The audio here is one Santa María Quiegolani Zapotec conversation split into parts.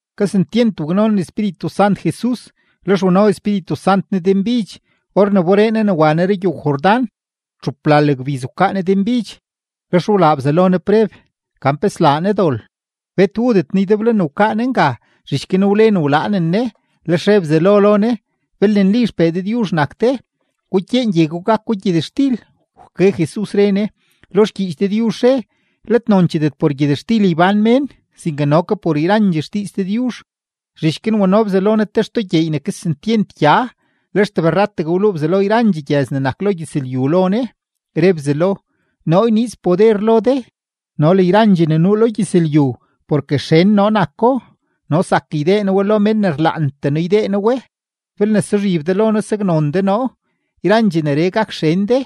Kesentyent waknonen Espíritu Sant Jesus, lex wano Espíritu Sant Ne denbidx or ne wberee Ne ne wa Ne rugyow-Jordán. Txuplal gbiz wkaa Ne denbidx, lex wlaa Bzelo Ne preb gan pe slaa Ne dol. Bet wudet Ne ydeblo ne wkaa Ne nga, zhich guin wlen wlaanen Ne. Lex re Bzelo lo Ne: ―Belne nli XPee Dëdyuzh nak de, gukyeen gye gwa gako gyëtxtil. Wke Jesus, re Ne: ―Lo xgyiich Dëdyuzh re: “Let noncheedet por gyëtxtil ybán mén, sinke no ke por yrandxee xdiiz Dëdyuzh.” Zhich guin wano Bzelo Ne te xtoo gyeey ne kesentyent gya, lex tebrrategue wluu Bzelo yrandxee gyëz ne nak lo gyëzlyu lo Ne. Re Bzelo: ―Noo yniiz poder lo de no le yrandxee ne nuu lo gyëzlyu, porke xen noo nako, no zak ydee noo we lo men ne rlaantee noo ydee noo we. Belne suzhib de lo noo saknon de noo, yrandxee neree gak xen de.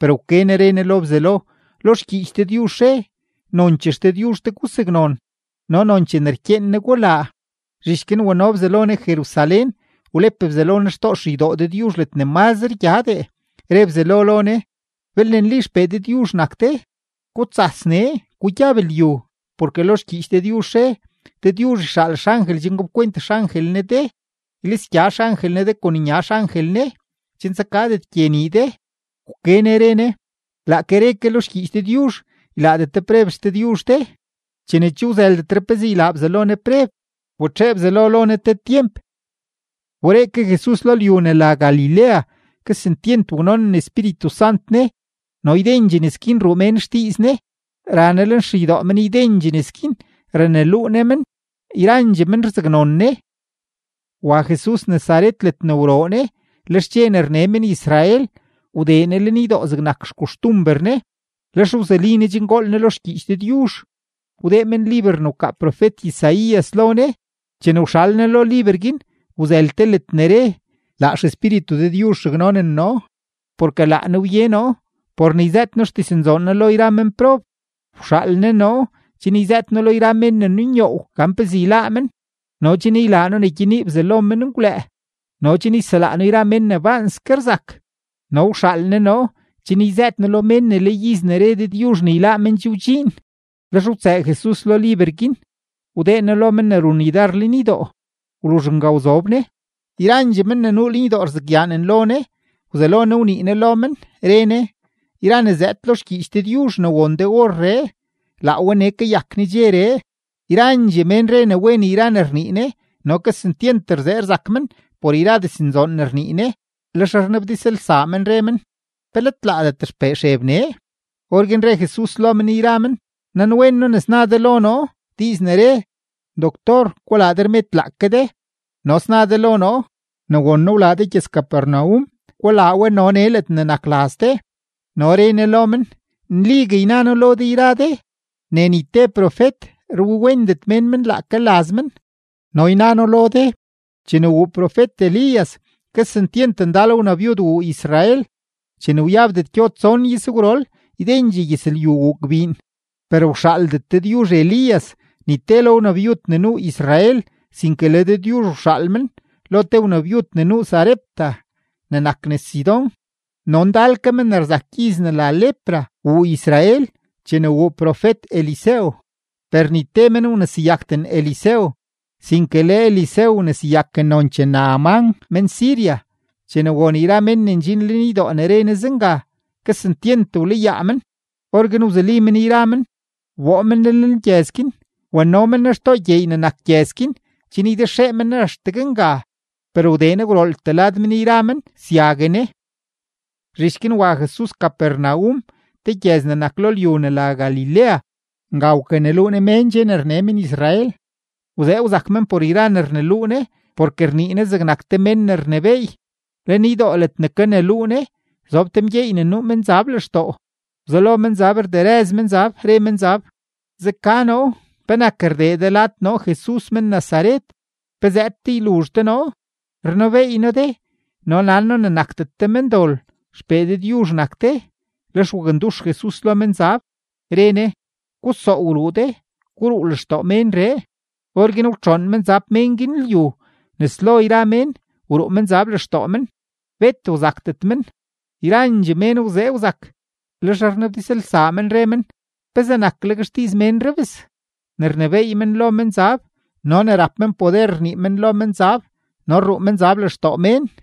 Per wke Ne re Ne lo Bzelo: ―Lo xgyiich Dëdyuzh re: “Nonchee XDëdyuzh de gusaknon, no nonchee ne rkyeen Ne gulaa.” Zhich guin wano Bzelo Ne Jerusalén, wlep Bzelo Ne xtoo xeydoo Dëdyuzh ledne mazre gyadee, re Bzelo lo Ne: ―Belne nli XPee Dëdyuzh nak de, gutsas nee, gugyab lyu; porke lo xgyiich Dëdyuzh re: Dëdyuzh yxaal xangel chen gapkwent xangel Ne de. Ylisgya xangel Ne de kon nya xangel Ne chen tsakadet gye nii de. Wke Ne re Ne: ―Laake re ke lo xgyiich Dëdyuzh: “Ylaadet de preb XDëdyuzh de.” Chene che wzëldetre pezee ylaa Bzelo Ne preb, wbetxee Bzelo lo Ne te tyemp. Wberee ke Jesus lo lyu ne la Galilea, kesentyent waknonen Espíritu Sant Ne, no ydendxee nes guin ruu mén xdiiz Ne. Ra Ne lenxeydoo men ydendxee nes guin, raneluu Ne men; yrandxee men rzaknon Ne. Wa Jesus Nazaret ledne wroo Ne. Lex dxe ne rne men-Israel, wdee Ne lenydoo zegnak xkoxtumber Ne, lex wzuli Ne chen gool Ne lo xgyiich Dëdyuzh. Wdee men liber ne wkaa profet-Isaías lo Ne. Chene wxal Ne lo liber guin, wzël te ledne re: Laa XEspíritu Dëdyuzh raknonen noo, porke laa Ne wye noo por ne yzëët noo xdiznzoon Ne lo yra menprob. Wxaal Ne noo chen yzëët noo lo yra men ne nunyoow gan pezee yláá men, no chen ylaa noo ne gyenii bzalo menngwlëë, no chen yselaa noo yra men ne baanske rzak, no wxaal Ne noo chen yzëët noo lo mén ne le iz ne re Dëdyuzh ne yláá men che wdxiin. Lex wtsëë Jesus lo liber guin wdee No lo men ne run yudar lenydoo, wluzh nga wzob Ne. Yrandxee men ne nuu lenydoo rzakyaanen lo Ne. Wzelo Ne wnii Ne lo men, re Ne: ―Yra ne zëëd lo xgyiich Dëdyuzh ne won de orree, laa we nee kayak nedxeree. Yrandxee mén re ne wen yra ne rnii Ne, no kesentyent rzee rzak men por yra diznzoon ne rnii Ne. Lex rnabdizlsaa men, re men: ―¿Pe let laadet xpee Xeb nee? Orguin re Jesus lo men yra men: ―Nanwen noo ne sna de lo noo, diiz ne re: “Doctor, gulaa de rmed laake de”, no sna de lo noo: “Ne won noo wlaa de gyëz-Capernaum, gulaa we no nee ledne nak laz de.” No re Ne lo men: ―Nligue yna noo lo de yra de ne ni te profet rwiwendet mén men laake laz men. No yna noo lo de, chene wuu profet-Elías, kesentyent ndal wnabyud wuu Israel, chene wyabdet gyo tson izgwrol, ydendxee gyëzlyu wuu gbiin, per wxaaldet Dëdyuzh Elías ni te lo wnabyud ne nuu Israel, sinke le Dëdyuzh wxaal men lo te wnabyud ne nuu Sarepta ne nak nes Sidón. No ndal ke men ne rzak gyiz ne la lepra wuu Israel chene wuu profet-Eliseo, per ni te men wneseyakden Eliseo, sinke le Eliseo wneseyaken nonchee Naamán men-Siria. Chene won yra men ne ndxin lenydoo ne re Ne zenga, kesentyent wlayaa men. Orguin wzuli men yra men, wboo men Ne lenlgyëz guin; wano men Ne xtoo gyeey ne nak gyëz guin, chen ydexee men Ne axtegue nga. Per wdee Ne gwrooltee lad men yra men syague Ne. Zhich guin wa Jesus Capernaum te gyëz ne nak lo lyu ne la Galilea. Nga wkaneluu Ne mén dxe ne rne men-Israel. Wzee wzak men por yra ne rneluu Ne, porke rnii Ne zegnak te men ne rnebééy. Lenydoo ledne kaneluu Ne, zob te mgyeey ne nuu menzab lextoo. Wzelo menzab rderëz menzab, re menzab: ―Zeka noo; ¿penak rdee de lad noo Jesus men-Nazaret? ¿Pe zëëd de yluzh de noo? Rnebeey noo de no nan noo ne nakdet de mendol, XPee Dëdyuzh nak de. Lex wakndux Jesus lo menzab, re Ne: ―¡Gusoow ruu de! ¡Guruu lextoo ménree! Orguin wtxoon menzab mén guin lyu nes lo yra mén, wruu menzab lextoo men, bet wzakdet men. Yrandxee mén wzee wzak, lex rnabdizlsaa men, re men: ―¿Pezee nakleg xdiiz ménree bes ne rnebééy men lo menzab no ne rap men poder rnii men lo menzab no rruu menzab lextoo mén?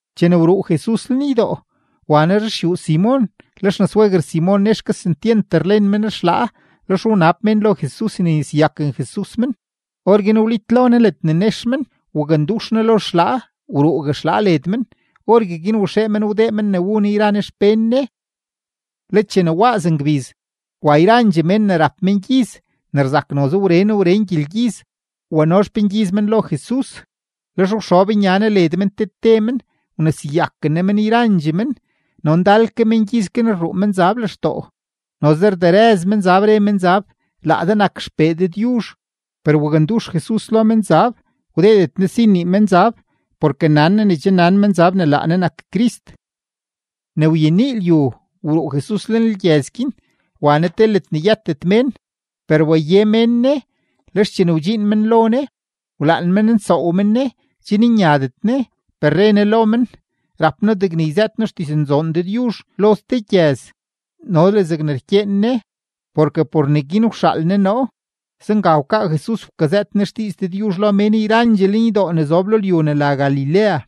Chene wruu Jesus lenydoo, wa Ne ruxyuu Simon. Le xnasweguer Simon nex kesentyent rlen men xlaa, lex wnab mén lo Jesus ne yneseyaken Jesus men. Orguin wlitlo Ne ledne nex men, wakndux Ne lo xlaa, wruugue xlaa led men. Orgueguin waxee men wdee men ne wu Ne yra Ne xpén Ne. Le chene waaz ngbiz, wa yrandxee mén ne rap mengyiz ne rzak noze wren wren gyelgyiz wano xpengyiz men lo Jesus. Lex wxob nya Ne led men te te men, wneseyaken Ne men yrandxee men. No ndal ke mengyiz guin rruu menzab lextoo, noze rderëz menzab, re menzab: ―Laa de nak XPee Dëdyuzh. Per wakndux Jesus lo menzab, wdeedet Ne si nnii menzab porke nan Ne ne che nan menzab ne laa Ne nak Crist. Ne wyenii lyu, wruu Jesus lenlgyëz guin wa Ne te ledne yëtet mén. Per waye mén Ne, lex chene wdxiin men lo Ne, wlaan men nsoow men Ne chen nyadet Ne, per re Ne lo men: ―Rap noo degne yzëët noo xdiznzoon Dëdyuzh lo ste gyëz no le zegne rkyeen Ne, porke por neguin wxaal Ne noo. Zenga wkaa Jesus wkazëët Ne xdiiz Dëdyuzh lo mén yrandxee lenydoo ne zob lo lyu ne la Galilea.